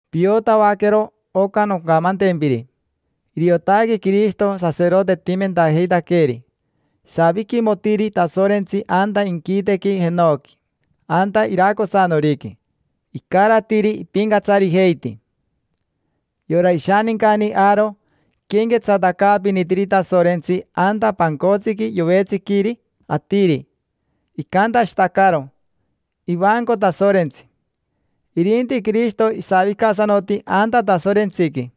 Piotavaquero oca noncamantempiri: iriotaque Quirishito saserotetimentajeitaqueeri. Isaviquimotiri Tasorentsi anta inquitequi jenoqui, anta iracosanoriqui; icaratiri ipincatsarijeiti. Yora ishanincani Aaro iquenquetsatacaapinitiri Tasorentsi anta pancotsiqui yovetsiquiri atiri, icantashitacaro: “Ivanco Tasorentsi”. Irinti Quirishito isavicasanoti anta Tasorentsiqui: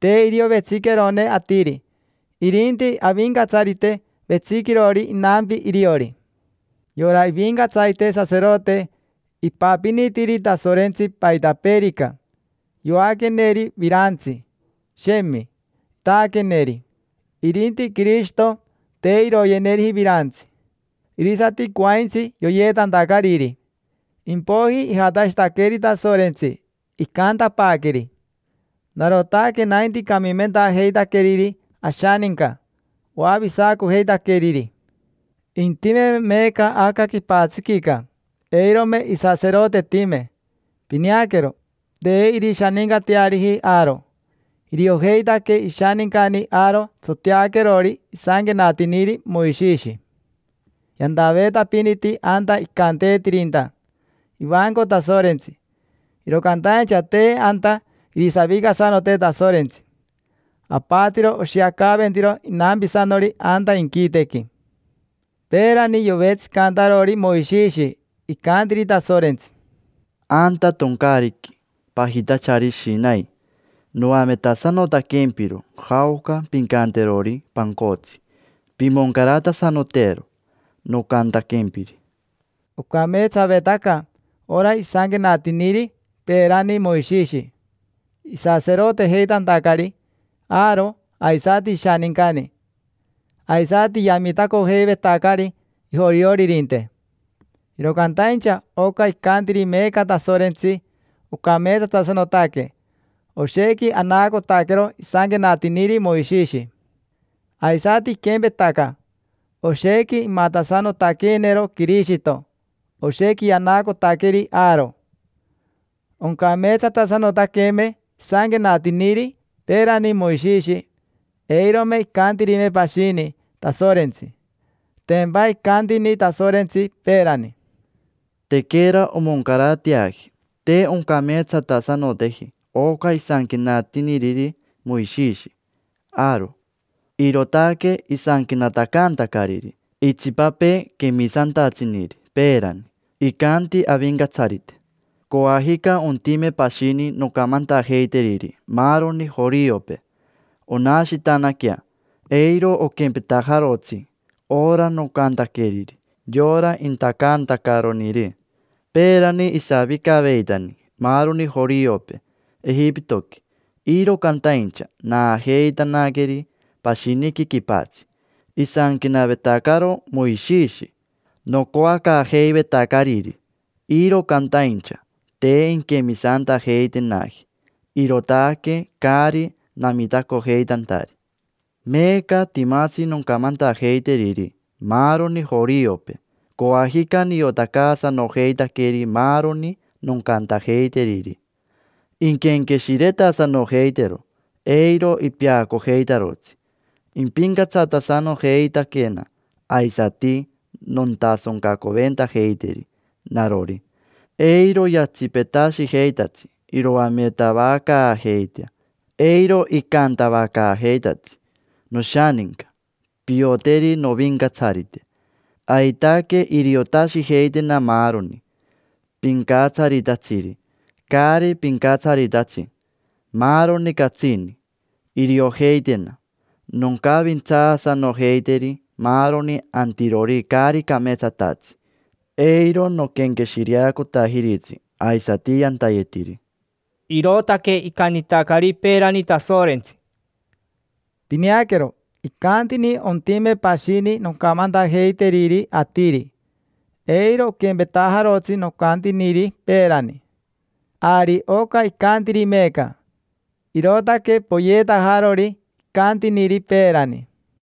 te irio vetsiquerone atiri, irinti Avincatsarite vetsiquirori inampi iriori. Yora ivincatsarite saserote ipapinitiri Tasorentsi paitapeerica; yoaqueneri virantsi, shemi; itaaqueneri. Irinti Quirishito, te iroyeneriji virantsi; irisati coaintsi yoyeetantacariri. Impoiji ijatashitaqueri Tasorentsi, icantapaaqueri: “Narotaque nainti camimentajeitaqueriri ashaninca, oavisacojeitaqueriri”. Intimeme meeca aca quipatsiquica, eirome isaserotetime; pineaquero, te irishanincateariji Aaro: iriojeitaque ishanincani Aaro tsoteaquerori isanquenatiniri Moishishi. Yantaveetapiniti anta icanteetirinta: “Ivanco Tasorentsi”, iro cantaincha te anta irisavicasanote Tasorentsi. Apatiro oshiacaventiro inampisanori anta inquitequi. Peerani, yovetsicantarori Moishishi, icantiri Tasorentsi: “Anta toncaariqui pajitachari Shinai noametasanotaquempiro jaoca pincanterori pancotsi: pimoncaratasanotero nocantaquempiri”. Ocameetsavetaca ora isanquenatiniri peerani Moishishi, isaserotejeitantacari Aaro aisati ishanincani, aisati yamitacojeivetacari ajorioririnte. Iro cantaincha oca icantiri meeca Tasorentsi ocameetsatasanotaque, oshequi anaacotaquero isanquenatiniri Moishishi. Aisati iquempetaca, oshequi imatasanotaqueenero Quirishito, oshequi yanaacotaqueri Aaro. Oncameetsatasanotaqueme isanquenatiniri peerani Moishishi, eirome icantirime pashini Tasorentsi. Tempa icantini Tasorentsi peerani: “Tequera omoncarateaji, te oncameetsatasanoteji oca isanquenatiniriri Moishishi Aaro”. Irootaque isanquenatacantacariri itsipapee quemisantatsiniri peerani: “Icanti Avincatsarite: ‘Coajica ontime pashini noncamantajeiteriri maaroni joriopee, onashitanaquea. Eiro oquempetajarotsi ora nocantaqueriri yora intacantacaroniri. Peerani isavicaveitani maaroni joriopee Ejipitoqui, iro cantaincha naajeitanaqueri pashiniqui quipatsi. Isanquenavetacaro Moishishi nocoacaajeivetacariri, iro cantaincha te inquemisantajeitenaji. Irootaque caari namitacojeitantari. Meeca timatsi noncamantajeiteriri maaroni joriopee. Coajica niotacaasanojeitaqueri maaroni noncantajeiteriri, inquenqueshiretasanojeitero, eiro ipeacojeitarotsi. Impincatsatasanojeitaquena, aisati nontasoncacoventajeiteri narori. Eiro yatsipetashijeitatsi iroametavacaajeitea, eiro icantavacaajeitatsi: “Noshaninca, pioteri Novincatsarite”. Aitaque iriotashijeitena maaroni: pincatsaritatsiri, caari pincatsaritatsi, maaroni catsini, iriojeitena. Noncavintsaasanojeiteri maaroni antirori caari cameetsatatsi, eiro noquenqueshireacotajiritsi aisati yantayetiri’”. Irootaque icantitacari peerani Tasorentsi. Pineaquero, icantini: “Ontime pashini noncamantajeiteriri atiri, eiro oquempetajarotsi nocantiniri peerani”. Ari oca icantiri meeca, irootaque poyeetajarori icantiniri peerani.